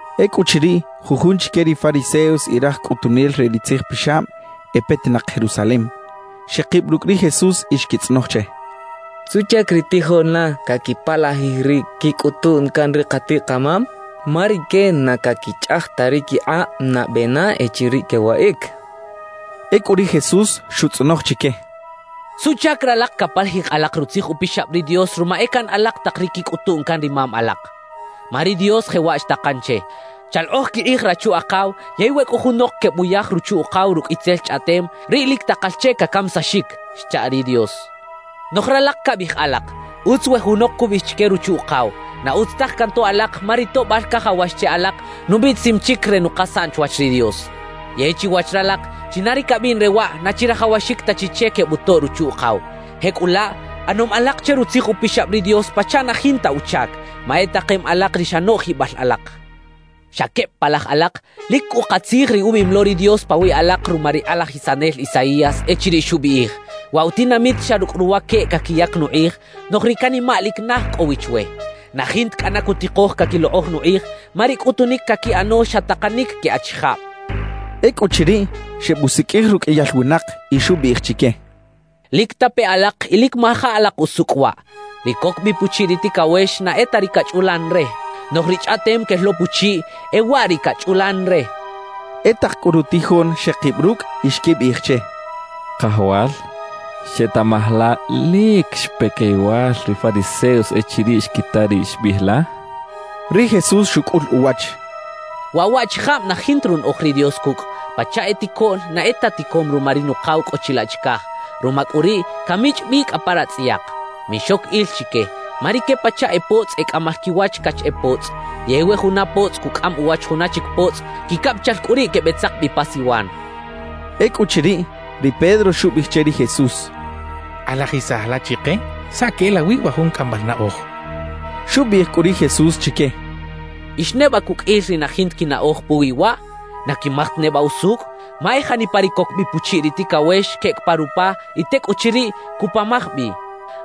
Ecꞌuchiriꞌ, jujun chique ri fariseos y raj cꞌutunel re ri tzijpixab e petinak Jerusalem, xekib rucꞌ ri Jesús y xquitzꞌonoj che: —¿Suꞌchac ri tijoꞌn la caquipalajij ri quicꞌutuꞌn can ri katiꞌ-kamam? Ma rique na caquichꞌaj ta ri quikꞌab nabe na echiriꞌ quewaꞌic —xechaꞌ. Ecꞌu ri Jesús xutzꞌonoj chique: —¿Suꞌchac ralak capalajij alak Rutzij Upixab ri Dios ruma e caꞌan alak tak ri quicꞌutuꞌn can ri mam alak? Ma ri Dios jewaꞌ xtakan che: Chalokꞌoj quikꞌij rachu-akaw yey We cꞌo junok quebuyaj ruchu-ukaw rucꞌ itzel chꞌaꞌtem, riꞌ lic takal che cacamisaxic xcha ri Dios. »Noꞌj ralak cabiꞌij alak: “Utz we junok cubiꞌij chique ruchu-ukaw: Na utz taj cantoꞌ alak, ma ri toꞌbal cajawax che alak, nubiꞌtisim chic re nukasaꞌn chwach ri Dios.” Yey chiwach ralak, china ri cabiꞌn re waꞌ, na chirajawaxic ta chi che quebutoꞌ ruchu-ukaw. Jecꞌulaꞌ ꞌanom alak che Rutzij Upixab ri Dios pachaꞌ na jinta uchac, ma e takem alak ri xa noꞌjibal alak. »¡Xa queb palaj alak! Lic cꞌu katzij ri ubiꞌim lo ri Dios pawiꞌ alak ruma ri kꞌalajisanel Isaías, echiriꞌ xubiꞌij: Waꞌ wa tinamit xa rucꞌ ruwaqueꞌ caquiyac nukꞌij, noꞌj ri canimaꞌ lic naj cꞌo wi chwe. Na jinta cꞌana cutikoj caquilokꞌoj nukꞌij, ma ri cꞌutunic caquiꞌano xa takanic que achijab —xchaꞌ. Ecꞌuchiriꞌ, xebusiqꞌuij ruqꞌuiyal winak y xubiꞌij chique: —Lic tape alak y lic maja alak usucꞌ waꞌ: Ri coc bi puchiꞌ ri ticawex na e ta ri cachꞌulan re; noꞌj ri chꞌaꞌtem quel lo puchiꞌ, e waꞌ ri cachꞌulan re —xchaꞌ. E tak cꞌu rutijoꞌn xekib rucꞌ y xquibiꞌij che: —Kajawal, ¿xetaꞌmaj la lic xpe coyowal ri fariseos echiriꞌ xquita ri xbiꞌij la? —xechaꞌ. Ri Jesús xucꞌul uwach: —Waꞌ waꞌchijab na jinta runaꞌoj ri Dios cucꞌ, pachaꞌ e ticoꞌn na e ta ticom ruma ri Nukaw cꞌo chilaꞌ chicaj; ruma cꞌu riꞌ, camichꞌ bi cꞌa pa ratzꞌayak. Mixoc il chique, ma rique pachaꞌ e potzꞌ e cꞌamal quiwach cach e potzꞌ. Yey we juna potzꞌ cucꞌam uwach juna chic potzꞌ, quicabichal cꞌu riꞌ quebeꞌtzak bi pa siwan —xchaꞌ. Ecꞌuchiriꞌ, ri Pedro xubiꞌij che ri Jesús: —Kꞌalajisaj la chike saꞌ queꞌelawi wa jun cꞌambal naꞌoj —xchaꞌ. Xubiꞌij cꞌu ri Jesús chique: —¿Ix neba cuqꞌuil ri na jinta quinaꞌoj puwi waꞌ? ¿Na quimaj ta neba usucꞌ? Ma e janipa ri coc bi puchiꞌ ri ticawex queꞌec pa rupa y tecꞌuchiriꞌ, cuꞌpamaj bi.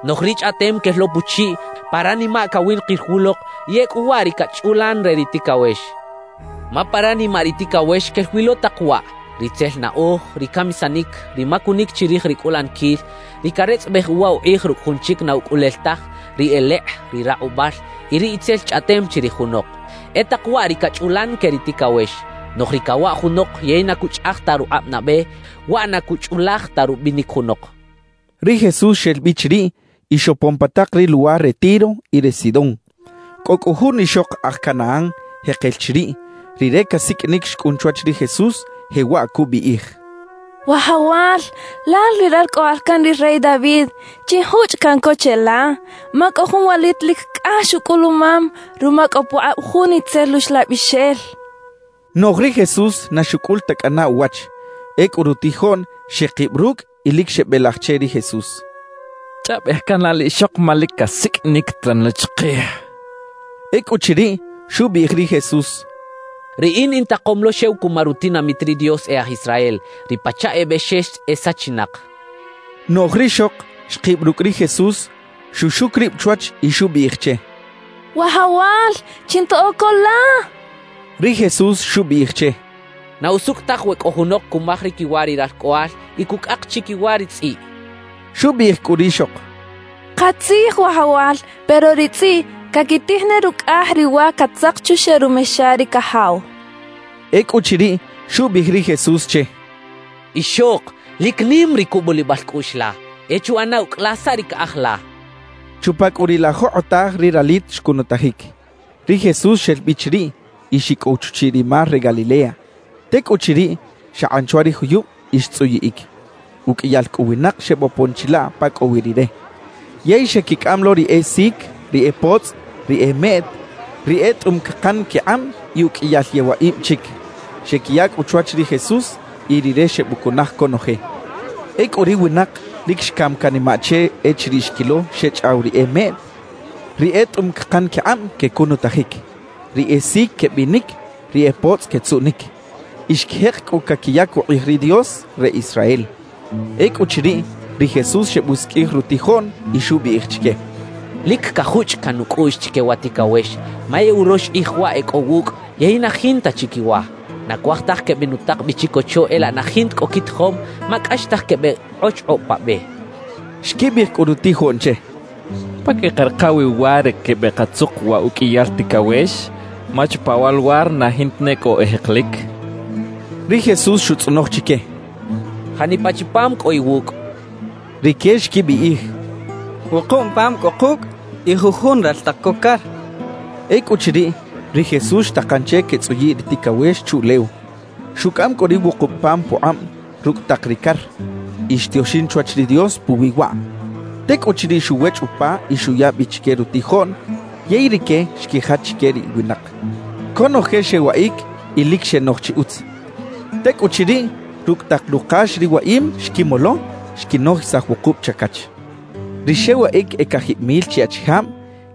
Noꞌj ri chꞌaꞌtem quel lo puchiꞌ, pa ranimaꞌ cawinakir wulok y ecꞌu waꞌ ri cachꞌulan re ri ticawex. Ma pa ranimaꞌ ri ticawex quel wi lo tak waꞌ: ritzel naꞌoj, ri camisanic, ri macunic chirij ri cꞌulaniquil, ri caretzꞌabej uwa ukꞌij rucꞌ jun chic na ucꞌulel taj, ri elekꞌ, ri rakꞌubal y ri itzel chꞌaꞌtem chirij junok. E tak waꞌ ri cachꞌulan que ri ticawex. Noꞌj ri cawaꞌ junok yey na cuchꞌaj ta rukꞌab nabe, waꞌ na cuchꞌulaj ta rubinic junok —xchaꞌ. Ri Jesús xel bi chiriꞌ y xopon pa tak ri luwar re Tiro y re Sidón. Cꞌo cꞌu jun ixok aj Canaán jekel chiriꞌ, rire casiqꞌuinic xcꞌun chwach ri Jesús, jewaꞌ cubiꞌij: —¡Wajawal, lal ri Ralcꞌoꞌal can ri rey David, chinjuchꞌ caꞌn co cheꞌla! Ma cꞌo jun walit lic cꞌax ucꞌulumam ruma cꞌo pukꞌab jun itzel uxlabixel —xchaꞌ. Noꞌj ri Jesús na xucꞌul ta cꞌana uwach. Ecꞌu rutijoꞌn xekib rucꞌ y lic xebelaj che ri Jesús: —Chꞌaꞌbej can la liꞌxok ma lic casiqꞌuinic teran lo chikij —xechaꞌ. Ecꞌuchiriꞌ, xubiꞌij ri Jesús: —Riꞌin intakom lo xew cuma rutinamit ri Dios e aj Israel, ri pachaꞌ e bexex e sachinak —xchaꞌ. Noꞌj rixok xkib rucꞌ ri Jesús, xuxuc rib chwach y xubiꞌij che: —¡Wajawal, chintoꞌo co la! —xchaꞌ. Ri Jesús xubiꞌij che: —Na usucꞌ taj we cꞌo junok cumaj ri quiwa ri ralcꞌoꞌal y cucꞌak chiquiwa ri tzꞌiꞌ —xchaꞌ. Xubiꞌij cꞌu rixok: —Katzij, Wajawal, pero ri tzꞌiꞌ caquitij ne rucꞌaj ri wa catzak chuxeꞌ rumexa ri cajaw —xchaꞌ. Ecꞌuchiriꞌ, xubiꞌij ri Jesús che: —¡Ixok, lic nim ri cubulibal cꞌuꞌx la! E chuꞌana ucꞌ la saꞌ ri caꞌaj la —xchaꞌ. Chupa cꞌu riꞌ la jokꞌotaj ri ralit xcunutajic. Ri Jesús xel bi chiriꞌ y xicꞌow chuchiꞌ ri mar re Galilea; tecꞌuchiriꞌ, xakꞌan chwa ri juyub y xtzꞌuyiꞌic. Uqꞌuiyal cꞌu winak xebopon chilaꞌ pa cꞌo wi Rire. Yey xequicꞌam lo ri e sic, ri e potzꞌ, ri e meꞌt, ri e tꞌum cakan quikꞌab y uqꞌuiyal yewaꞌib chic. Xequiya cꞌu chwach ri Jesús, y Rire xebucunaj conoje. Ecꞌu ri winak lic xcam canimaꞌ che echiriꞌ xquilo xechꞌaw ri e meꞌt, ri e tꞌum cakan quikꞌab quecunutajic, ri e sic quebinic, ri e potzꞌ quetzuꞌnic. Y xquijek cꞌu caquiyac ukꞌij ri Dios re Israel. Ecꞌuchiriꞌ, ri Jesús xebusiqꞌuij rutijoꞌn y xubiꞌij chique: —Lic cajuchꞌ caꞌn nucꞌuꞌx chique wa ticawex, ma e urox kꞌij waꞌ e cꞌo wucꞌ yey na jinta chi quiwa. Na cuaj taj quebenutak bi chicocho e laꞌ na jinta cꞌo quitijom, ma cꞌaxtaj quebeꞌkꞌochkꞌob pa be —xchaꞌ. Xquibiꞌij cꞌu rutijoꞌn che: —¿Pa queꞌkarika wi wa re quebekatzuk wa uqꞌuiyal ticawex? Ma chupa wa luwar na jinta ne cꞌo e jekelic —xechaꞌ. Ri Jesús xutzꞌonoj chique: —¿Janipa chi pam cꞌo iwucꞌ? —xchaꞌ. Rique xquibiꞌij: —Wukub pam cꞌo kucꞌ y jujun raltak co car —xechaꞌ. Ecꞌuchiriꞌ, ri Jesús xtakan che quetzꞌuyiꞌ ri ticawex chuꞌlew. Xucꞌam cꞌu ri wukub pam pukꞌab rucꞌ tak ri car, y xtioxin chwach ri Dios puwi waꞌ. Tecꞌuchiriꞌ xuwechꞌ upa y xuya bi chique rutijoꞌn yey rique xquijach chique ri winak. Conoje xewaꞌic y lic xenoj chi utz. Tecꞌuchiriꞌ, rucꞌ tak rukax ri waꞌim xquimolo, xquinojisaj wukub chacach. Ri xewaꞌic e cajib mil chi achijab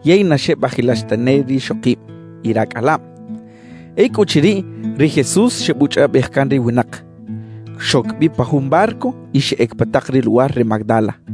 yey na xebajilax tane rixokib y racꞌalab. Ecꞌuchiriꞌ, ri Jesús xebuchꞌaꞌbej can ri winak; xoc bi pa jun barco y xeꞌec pa tak ri luwar re Magdala.